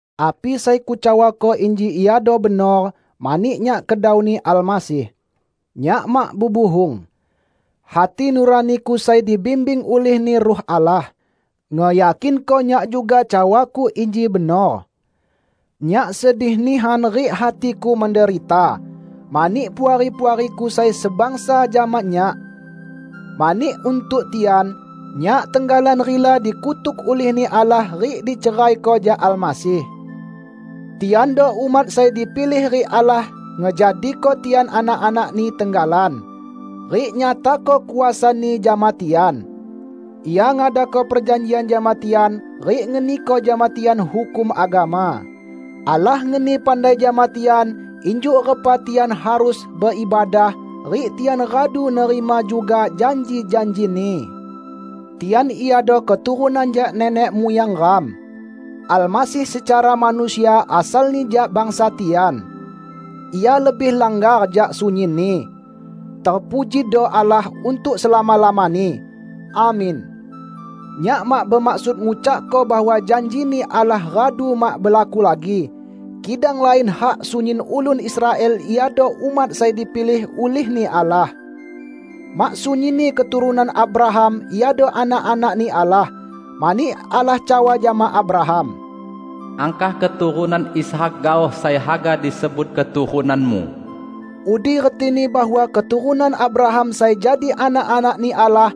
Api sai kucawako inji iado benor mani nyak kedauni Almasih. Nyak mak bebuhung. Hati nuraniku sai dibimbing ulih-Ni Ruh Allah, ngeyakinko nyak juga cawaku inji benor. Nyak sedih nihan rik hatiku menderita mani puari-puariku sai sebangsa jama nyak. Mani untuk tian, nyak tenggalan rila dikutuk ulih-Ni Allah rik diceraiko jak Almasih. Tiando umat sai dipilih rik Allah ngejadiko tian anak-anak-Ni tenggalan, rik nyatako kuasa-Ni jama tian. Ia ngadako perjanjian jama tian rik ngeniko jama tian hukum agama. Allah ngeni pandai jama tian injuk repa tian harus beibadah rik tian radu nerima juga janji-janji-Ni. Tian iado keturunan jak nenek muyang ram. Almasih secara manusia asalni jak bangsa tian. Ia lebih langgar jak sunyinni. Terpujido Allah untuk selama-lamani! Amin. Nyak mak bemaksud ngucakko bahwa janji-Ni Allah radu mak belaku lagi; kidang lain hak sunyin ulun Israel iado umat sai dipilih ulih-Ni Allah. Mak sunyinni keturunan Abraham iado anak-anak-Ni Allah. Mani Allah cawa jama Abraham, "Angkah keturunan Ishak gaoh sai haga disebut keturunanmu." Udi retini bahwa keturunan Abraham sai jadi anak-anak-Ni Allah,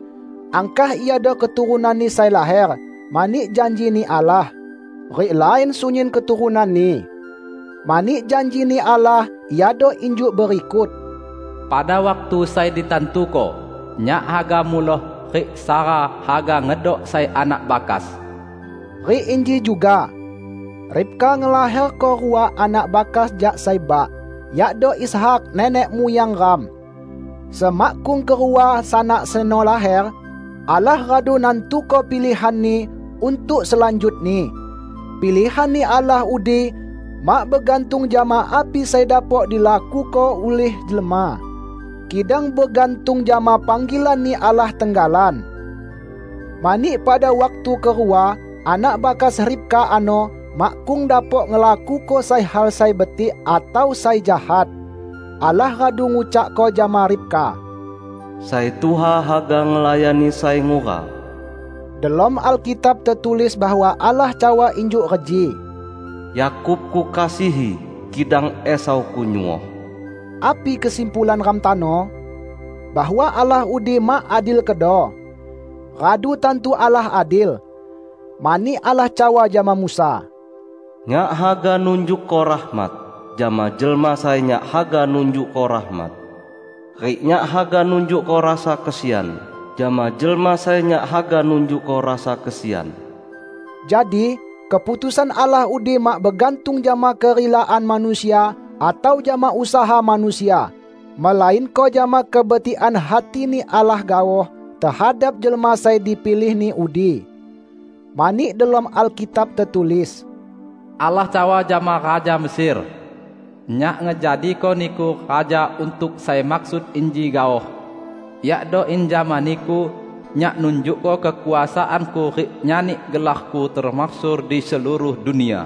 angkah iado keturunanni sai laher mani janji-Ni Allah; rik lain sunyin keturunanni. Mani janji-Ni Allah iado injuk berikut, "Pada waktu sai ditantuko, Nyak haga muloh, rik Sara haga ngedok sai anak bakas." Rik inji juga: Ribka ngelaherko rua anak bakas jak sai bak, yakdo Ishak nenek muyang ram. Semakkung kerua sanak seno laher, Allah radu nantuko pilihan-Ni untuk selanjutni. Pilihan-Ni Allah udi mak begantung jama api sai dapok dilakuko ulih jelma, kidang begantung jama panggilan-Ni Allah tenggalan. Mani pada waktu kerua anak bakas Ribka ano makkung dapok ngelakuko sai hal sai betik atau sai jahat, Allah radu ngucakko jama Ribka, "Sai tuha haga ngelayani sai ngura." Delom Alkitab tetulis bahwa Allah cawa injuk reji, "Yakub Kukasihi, kidang Esau Kunyuoh." Api kesimpulan ram tano? Bahwa Allah udi mak adil kedo? Radu tantu Allah adil! Mani Allah cawa jama Musa, "Nyak haga nunjukko rahmat jama jelma sai Nyak haga nunjukko rahmat, rik Nyak haga nunjukko rasa kesian jama jelma sai Nyak haga nunjukko rasa kesian." Jadi, keputusan Allah udi mak begantung jama kerilaan manusia atau jama usaha manusia, melainko jama kebetikan hati-Ni Allah gaoh tehadap jelma sai dipilih-Ni udi. Mani delom Alkitab tetulis, "Allah cawa jama raja Mesir, 'Nyak ngejadiko niku raja untuk sai maksud inji gaoh, yakdo in jama niku, Nyak nunjukko kekuasaan-Ku rik nyani gelar-Ku temasyhur di seluruh dunia.' "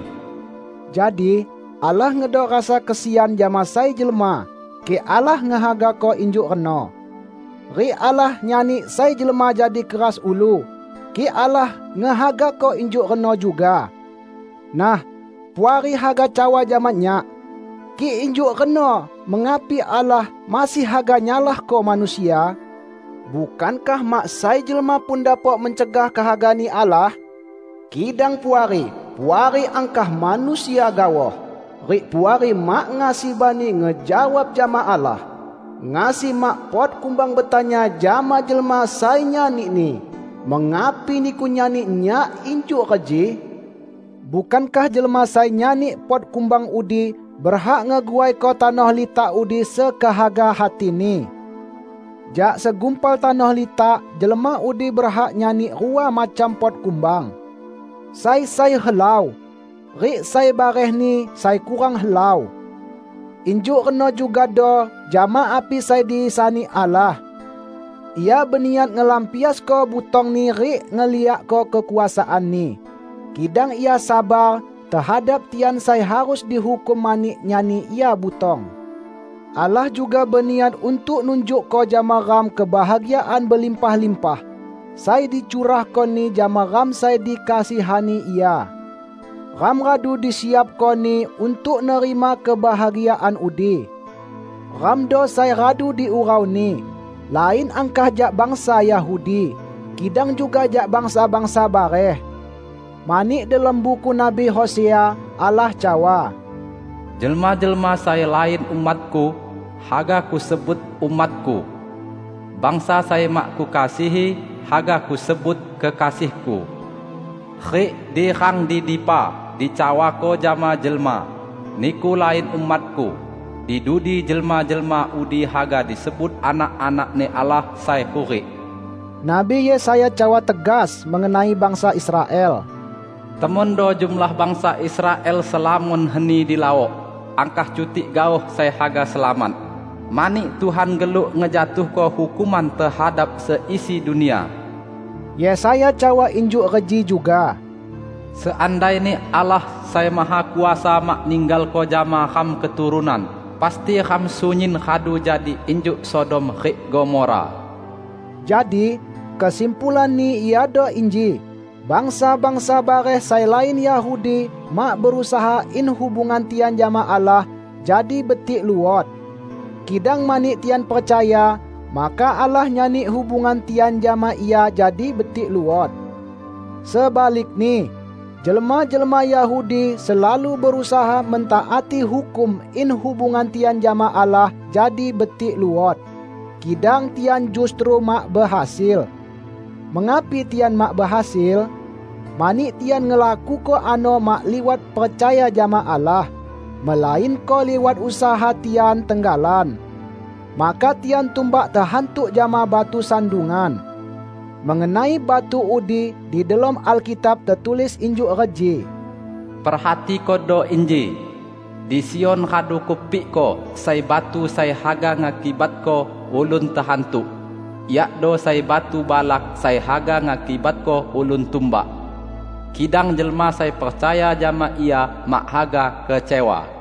Jadi, Allah ngedok rasa kesian jama sai jelma, kik Allah ngehagako injuk reno. Rik Allah nyani sai jelma jadi keras ulu, kik Allah ngehagako injuk reno juga. Nah, Puari haga cawa jama nyak, "Kik injuk reno mengapi Allah masih haga nyalahko manusia? Bukankah mak sai jelma pun dapok mencegah kehaga-Ni Allah?" Kidang, Puari! Puari angkah manusia gaoh. Rik Puari mak ngasi bani ngejawab jama Allah! Ngasi mak pot kumbang betanya jama jelma sai nyanini, "Mengapi niku nyani nyak injuk reji?" Bukankah jelma sai nyani pot kumbang udi berhak ngeguaiko tanoh litak udi sekehaga hatini? Jak segumpal tanoh litak, jelma udi berhak nyani rua macam pot kumbang: sai sai helau, rik sai barehni sai kurang helau. Injuk reno jugado jama api sai disani Allah. Ia beniat ngelampiasko butong-Ni rik ngeliakko kekuasaan-Ni. Kidang Ia sabar tehadap tian sai harus dihukum mani nyani Ia butong. Allah juga beniat untuk nunjukko jama ram kebahagiaan belimpah-limpah sai dicurahko-Ni jama ram sai dikasihani Ia. Ram radu disiapko-Ni untuk nerima kebahagiaan udi. Ramdo sai radu diurau-Ni, lain angkah jak bangsa Yahudi, kidang juga jak bangsa-bangsa bareh. Mani delom buku Nabi Hosea, Allah cawa, "Jelma-jelma sai lain umat-Ku, haga Kusebut 'umat-Ku'. Bangsa sai mak Kukasihi, haga Kusebut 'Kekasih-Ku'. Rik di rang di dipa dicawako jama jelma, 'Niku lain umat-Ku,' di dudi jelma-jelma udi haga disebut anak-anak-Ni Allah sai hurik." Nabi Yesaya cawa tegas mengenai bangsa Israel, "Temondo jumlah bangsa Israel selamon heni di laok, angkah cutik gaoh sai haga selamat; mani Tuhan geluk ngejatuhko hukuman tehadap seisi dunia." Yesaya cawa injuk reji juga, "Seandaini Allah Sai Mahakuasa mak ninggalko jama ram keturunan, pasti ram sunyin radu jadi injuk Sodom rik Gomora." Jadi, kesimpulanni iado inji: Bangsa-bangsa bareh sai lain Yahudi mak berusaha in hubungan tian jama Allah jadi betik luot. Kidang mani tian percaya, maka Allah nyani hubungan tian jama Ia jadi betik luot. Sebalikni, jelma-jelma Yahudi selalu berusaha mentaati hukum in hubungan tian jama Allah jadi betik luot. Kidang tian justru mak behasil. Mengapi tian mak behasil? Mani tian ngelakuko ano mak liwat percaya jama Allah, melainko liwat usaha tian tenggalan. Maka tian tumbak tehantuk jama "Batu Sandungan". Mengenai batu udi di delom Alkitab tetulis injuk reji, "Perhatikodo inji: Di Sion radu Kupikko sai batu sai haga ngakibatko ulun tehantuk; yakdo sai batu balak sai haga ngakibatko ulun tumbak. Kidang jelma sai percaya jama Ia mak haga kecewa."